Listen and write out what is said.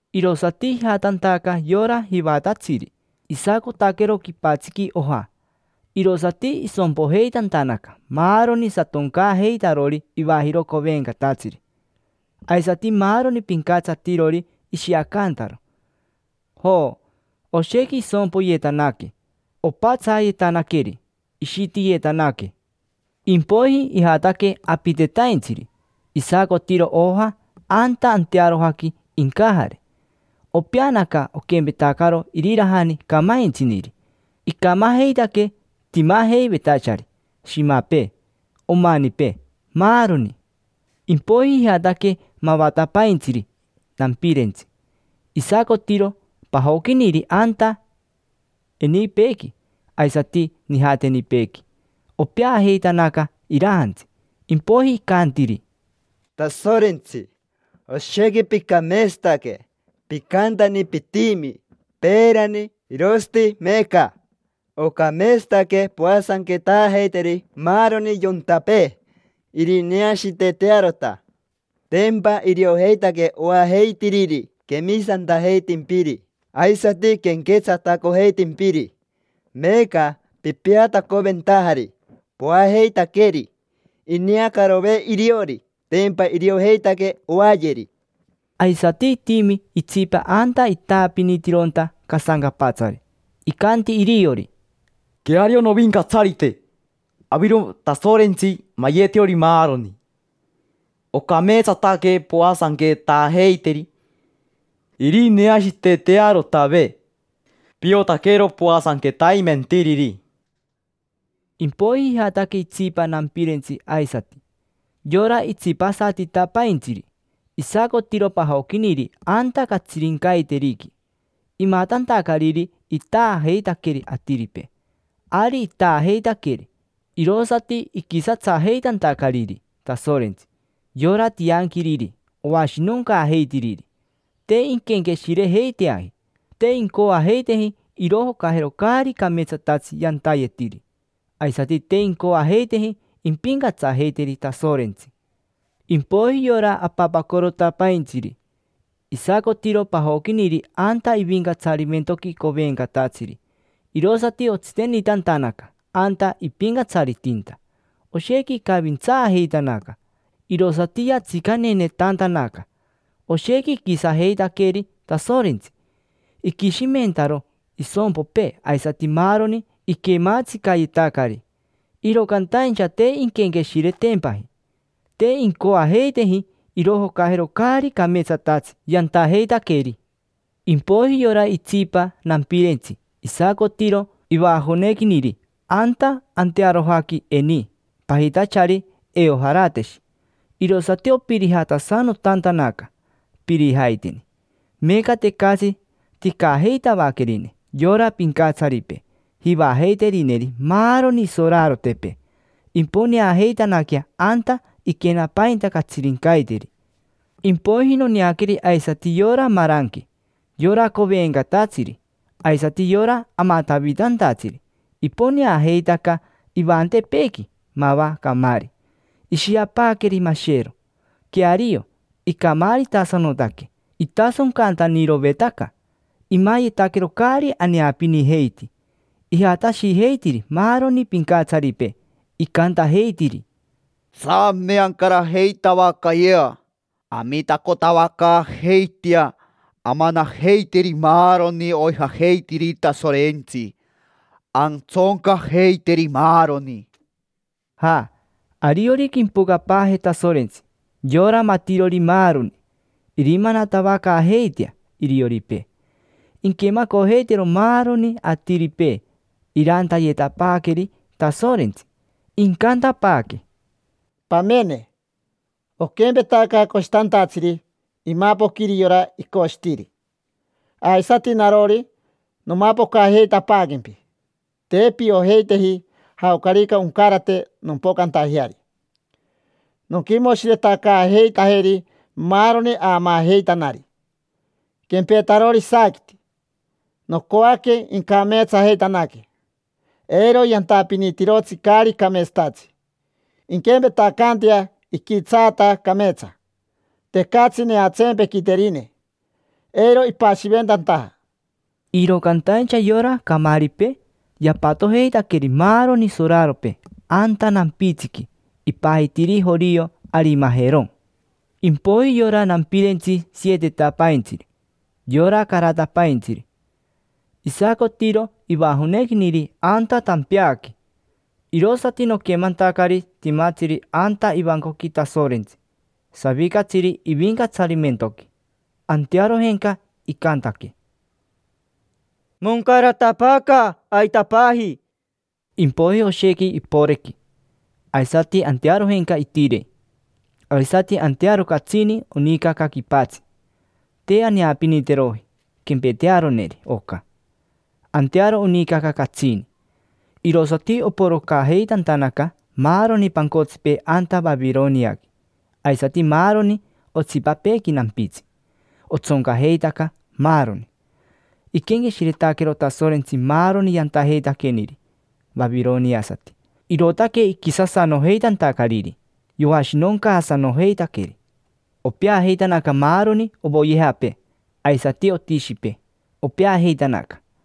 Irosati ijatantaca yora jivatatsiri. Isacotaquero quipatsiqui oja, irosati isompojeitantanaca maaroni satoncaajeitarori ivajiro covencatatsiri, aisati maaroni pincatsatirori ishiacantaro. Jo, oshequi isompoyetanaque; opatsayetanaqueri, ishitiyetanaque. Impoiji ijataque apitetaintsiri, isacotiro oja anta antearojaqui incajare. Opeanaca, oquempetacaro irirajani camaintsiniri. Icamajeitaque timajeivetachari: shimapee, omanipee, maaroni. Impoiji ijataque mavatapaintsiri nampirentsi, isacotiro pajoquiniri anta enipeequi aisati nijatenipeequi. Opeajeitanaca irajantsi. Impoiji icantiri: —Tasorentsi, oshequi picameetsataque; picantani pitimi: peerani, irosati meeca. Ocameetsataque poasanquetaajeiteri maaroni yontapee, irineashiitetearota; tempa iriojeitaque oajeitiriri quemisantajeitimpiri aisati quenquetsatacojeitimpiri. Meeca pipiatacoventajari, poajeitaqueri. Ineacarove iriori, tempa iriojeitaque oayeri. Aisati itimi itsipa anta itaapinitironta casancapatsari. Icanti iriori: —Queario, Novincatsarite, aviro Tasorentsi mayetirori maaroni. Ocameetsataque poasanquetaajeiteri, irineashiitetearotave: piotaquero poasanquetaimentiriri. Impoiji ijataque itsipa nampirentsi aisati, yora itsipasatitapaintsiri. Isacotiro pajoquiniri anta catsirincaiteriqui, imatantacariri itaajeitaqueri atiripee. Ari itaajeitaqueri, irosati iquisatsajeitantacariri Tasorentsi: yora tianquiriri oashinoncaajeitiriri. Te inquenqueshirejeiteaji. Te incoajeiteji irojocajero caari cameetsatatsi yantayetiri, aisati te incoajeiteji impincatsajeiteri Tasorentsi. Impoiji yora apapacorotapaintsiri, isacotiro pajoquiniri anta ivincatsarimentoqui covencatatsiri. Irosati otsitenitantanaca anta ipincatsaritinta. Oshequi icavintsaajeitanaca, irosati yatsicanenetantanaca. Oshequi iquisatsajeitaqueri Tasorentsi, iquishimentaro isompopee aisati maaroni iquemaatsicayetacari. Iro cantaincha te inquenqueshiretempaji, te incoajeiteji irojocajero caari cameetsatatsi yantajeitaqueri. Impoiji yora itsipa nampirentsi isacotiro ivajonequiniri anta antearojaqui eni pajitachari Eojarateshi, irosati opirijatasanotantanaca, pirijaiteni. Meeca tecatsi ticajeitavaquerine yora pincatsaripee jivajeiterineri maaroni isorarotepee. Imponeajeitanaquea anta iquenapainta catsirincaiteri. Impoiji noneaqueri aisati yora maranque, yora covencatatsiri, aisati yora amatavitantatsiri; iponeajeitaca ivantepeequi mava camaari, ishiapaaqueri mashero. Queario, icamaaritasanotaque; itasoncantanirovetaca, imayetaquero caari aneapinijeiti. Ijatashijeitiri maaroni pincatsaripee, icantajeitiri: —Tsame ancarajeitavacayea, amitacotavacaajeitea amanajeiteri maaroni oijajeitiriri Tasorentsi, antsoncajeiteri, maaroni. Ja, ariorica impocapaaje Tasorentsi, yora matirori maaroni, irimanatavacaajeitea irioripee. Inquemacojeitero maaroni atiripee irantayetapaaqueri Tasorentsi. Incantapaaque: —Pamene, oquempetaca coshitantatsiri imapoquiri yora icoshitiri, aisati narori, nomapocajeitapaaquempi. Te piojeiteji jaocarica oncarate nompocantajeari. Nonquimoshiretacaajeitajeri maaroni aamaajeitanari, quempetarori isaaquiti. Nocoaque incameetsajeitanaque, eiro yantapinitirotsi caari cameetsatatsi. Inquempetacantea iquitsaata cameetsa, tecatsi neatsempequiterine eiro ipashiventantaja. Iro cantaincha yora camaaripee yapatojeitaqueri maaroni soraropee anta nampitsiqui ipajitiri jorio Aramaqueroni. Impoiji yora nampirentsi sietetapaintsiri: yora caratapaintsiri. Isacotiro ivajonequiniri anta tampeaqui, irosati noquemantacari timatsiri anta ivancoqui Tasorentsi, savicatsiri ivincatsarimentoqui. Antearojenca icantaque: —Moncaratapaaca, aitapaji. Impoiji oshequi iporequi, porec, porec; aisati antearojenca itirei, tiiririri. Aisati antearo catsini onicaca quipatsi. Te aneapiniteroji quempetearoneri oca. Antearo onicaca catsini: nica, nica, nica, nica. Irosati oporocajeitantanaca maaroni pancotsipee anta Vavironiaqui, aisati maaroni otsipapeequi nampitsi, otsoncajeitaca maaroni, poyere. Iquenqueshiretaquero Tasorentsi maaroni yantajeitaqueniri vavironiasati, irootaque iquisasanojeitantacariri, yoashinoncaasanojeitaqueri. Opeajeitanaca maaroni ovoyejapee; aisati otishipee, opeajeitanaca, maani.